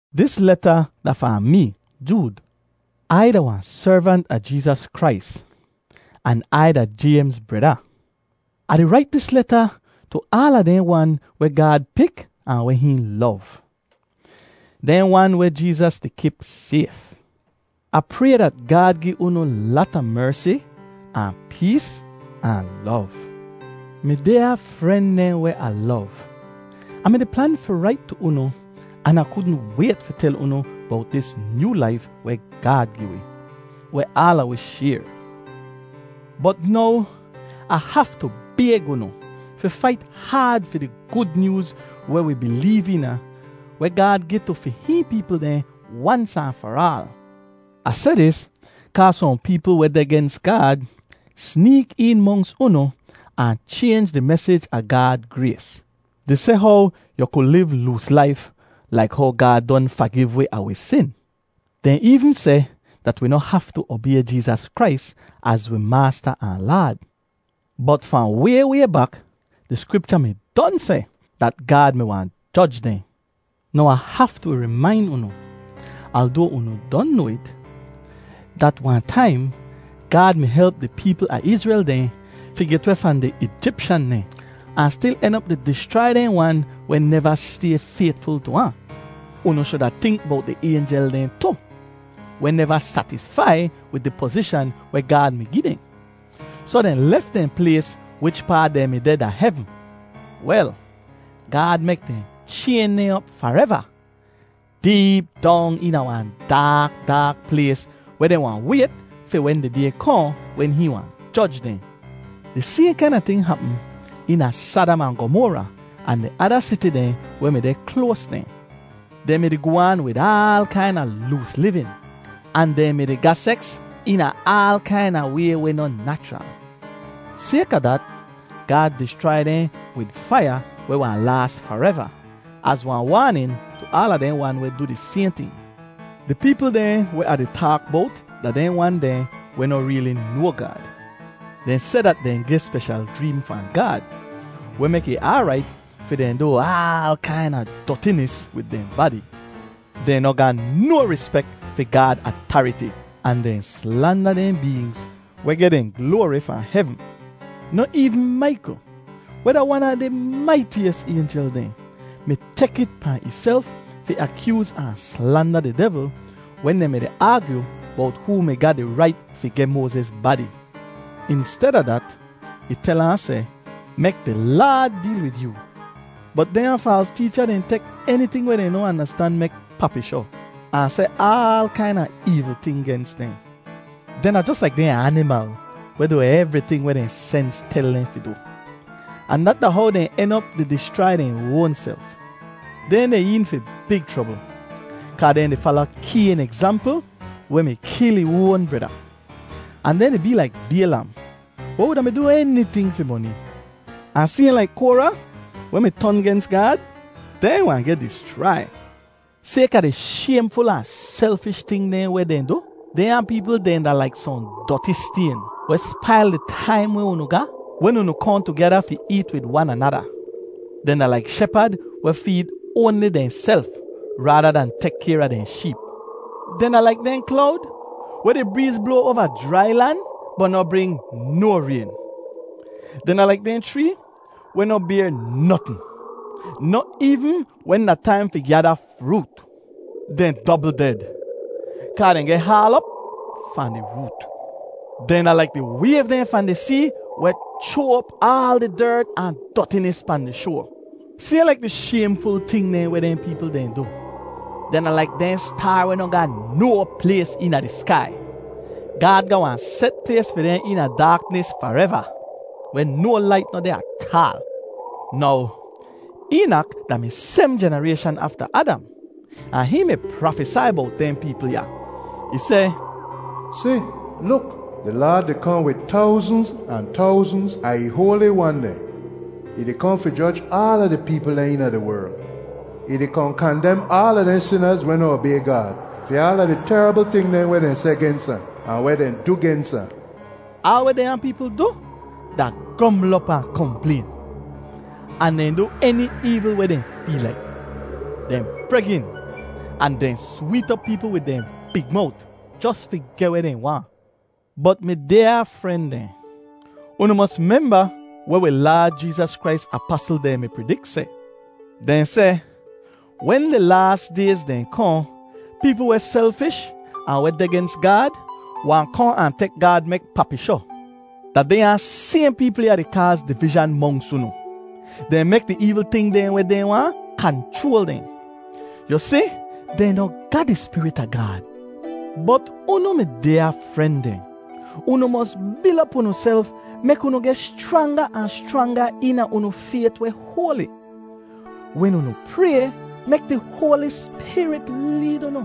Dis leta da fahn mee, Jood. Ai da wahn servant a Jeezas Krais, an Ai da Jaymz breda. Ah di rait dis leta tu aala dehn wan weh Gaad pik ahn weh hihn lov, dehn wan weh Jeezas di kip sayf. Ah pray dat Gaad gi unu lata mersi, ahn pees ahn lov. Mi dyaa fren dehn weh Ah lov, Ah mi-di plan fi rait tu unu an Ah kudn wayt fi tel unu bowt dis nyoo laif weh Gaad gi wi, weh aala wi shayr. Bot now, Ah haftu bayg unu fi fait haad fi di Gud Nyooz weh wi bileev eena, weh Gaad gi tu fi hihn peepl dehn wans ahn far aal. Ah seh dis kaa sohn peepl weh deh gens Gaad, sneek een monks unu ahn chaynj di mesij a Gaad grays, di seh how yu ku liv loos laif laik how Gaad don fagiv wi a wi sin. Dehn eevn seh dat wi noh haftu obay Jeezas Krais az wi Maasta ahn Laad. Bot fahn way way bak, di Skripcha mi don seh dat Gaad mi wahn joj dehn. Now Ah haftu rimain unu, aldoa unu don noa it, dat wahn taim Gaad mi help di peepl a Izrel dehn fi get weh fahn di Eejipshan dehn, ahn stil en op di dischrai dehn wan weh neva stay faytful tu ahn. Unu shuda tink bowt di aynjel dehn tu, weh neva satisfai wid di pozishan weh Gaad mi gi dehn, soh dehn lef dehn plays wichpaa dehn mi deh da hevn. Wel, Gaad mek dehn chayn dehn op fareva, deep dong eena wahn daak daak plays weh dehn wahn wayt fi wen di Day kohn wen hihn wahn joj dehn. Di sayhn kaina ting hapm eena Sadam ahn Gomora ahn di ada siti dehn weh mi deh kloas dehn. Dehn mi-di goh aan wid aal kaina loos livin, ahn dehn mi-di ga seks eena aal kaina way weh noh nachral. Sayka dat, Gaad dischrai dehn wid faiya weh wahn laas fareva az wahn waanin tu aala dehn wan weh du di sayhn ting. Di peepl dehn weh Ah di taak bowt da dehn wan dehn weh noh reeli noa Gaad. Dehn seh dat dehn geh speshal jreem fahn Gaad, weh mek ih aarait fi dehn du aal kaina dotinis wid dehn badi. Dehn noh ga no rispek fi Gaad atariti, ahn dehn slanda dehn beengz weh geh dehn gloari fahn hevn. Noh eevn Maikl, weh da wan a di maitiyis aynjel dehn, mi tek it pahn ihself fi akyooz ahn slanda di devl wen dehn mi-di aagyu bowt hoo mi ga di rait fi geh Moaziz badi. Insteda dat, ih tel ahn seh, “Mek di Laad deel wid yoo!” Bot dehnya faals teecha dehn tek eniting weh dehn noh andastan mek papishoh, ahn seh aal kaina eevl ting gens dehn. Dehn da jos laik dehn animal weh du evriting weh dehn sens tel dehn fi du, ahn dat da how dehn en op di dischrai dehn oanself. Dehn deh een fi big chrobl! Kaa dehn di fala Kayn egzampl, weh mi kil ih oan breda. Ahn dehn di bee laik Baylam weh wuda mi du eniting fi moni. Ahn sayhn laik Kora, weh mi ton gens Gaad, dehn wahn geh dischrai. Sayka di shaymful ahn selfish ting dehn weh dehn du, dehnya peepl dehn da laik sohn doti stayn weh spail di taim weh unu ga wen unu kohn tugeda fi eet wid wan anada. Dehn da laik shepad weh feed oanli dehnself raada dahn tek kayr a dehn sheep. Dehn da laik dehn klowd weh di breez bloa oava jrai lan, bot noh bring no rayn; dehn da laik dehn chree weh noh bayr notn, noh eevn wen da taim fi gyada froot. Dehn dobl ded, kaa dehn geh haal op fahn di root. Dehn da laik di wayv dehn fahn di see weh chroa op aal di dert ahn dotinis pahn di shoa, sayhn laik di shaymful ting dehn weh dehn peepl dehn du. Dehn da laik dehn staar weh noh ga no plays eena di skai. Gaad ga wahn set plays fi dehn eena daaknis fareva, weh no lait noh deh ataal. Now, Eenak da-mi sebm jenarayshan afta Adam, ahn hihn mi prafesai bowt dehn peepl ya. Ih seh, “Si, luk! Di Laad di kohn wid towznz ahn towznz a ih hoali wan dehn. Ih di kohn fi joj aala di peepl dehn eena di werl. Ih di kohn kandem aala dehn sinaz weh noh obay Gaad, fi aala di terabl ting dehn weh dehn seh gens ahn, ahn weh dehn du gens ahn.” Aal weh dehnya peepl du da grombl op ahn komplayn, ahn dehn du eni eevl weh dehn feel laik. Dehn bregin, ahn dehn sweet op peepl wid dehn big mowt jos fi geh weh dehn waahn. Bot mi dyaa fren dehn, unu mos memba weh wi Laad Jeezas Krais apasl dehn mi pridik seh. Dehn seh, “Wen di laas dayz dehn kohn, peepl weh selfish ahn weh deh gens Gaad wahn kohn ahn tek Gaad mek papishoh.” Da dehnya sayhn peepl ya di kaaz divizhan monks unu. Dehn mek di eevl ting dehn weh dehn waahn, kanchroal dehn. Yu si, dehn noh ga di Spirit a Gaad. Bot unu, mi dyaa fren dehn, unu mos bil op unuself mek unu geh schranga ahn schranga eena unu fayt weh hoali. Wen unu pray, mek di Hoali Spirit leed unu.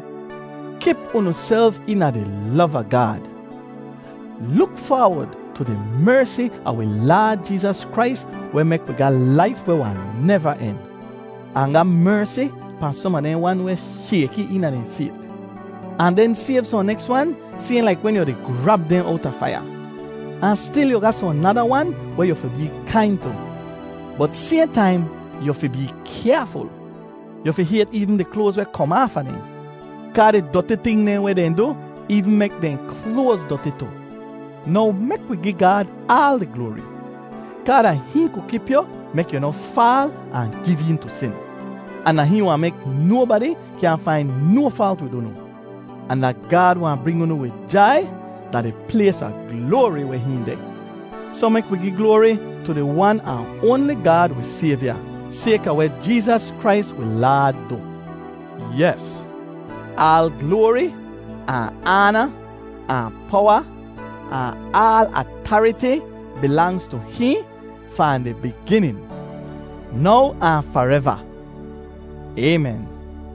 Kip unuself eena di lov a Gaad; luk faawod tu di mersi a wi Laad Jeezas Krais weh mek wi ga laif weh wahn neva en. Ahn ga mersi pahn som a dehn wan weh shayki eena dehn fayt; ahn den sayv sohn neks wan sayhn laik wen yu di grab dehn owta faiya; ahn stil yu ga sohn nada wan weh yu fi bee kain tu, bot sayhn taim, yu fi bee kyaaful. Yu fi hayt eevn di kloaz weh kom aafa dehn, kaa di doti ting dehn weh dehn du eevn mek dehn kloaz doti tu. Now, mek wi gi Gaad aal di gloari, kaa da hihn ku kip yu mek yu noh faal ahn giv een tu sin. Ahn da hihn wahn mek nobadi kyaahn fain no faalt wid unu. Ahn da Gaad wahn bring unu wid jai da di plays a gloari weh hihn deh. Soh, mek wi gi gloari tu di Wan ahn oanli Gaad wi Sayvya, sayka weh Jeezas Krais wi Laad du. Yes, aal gloari, ahn aana, ahn powa, ahn aal atariti bilangz tu hihn fahn di biginin, now ahn fareva. Aymen!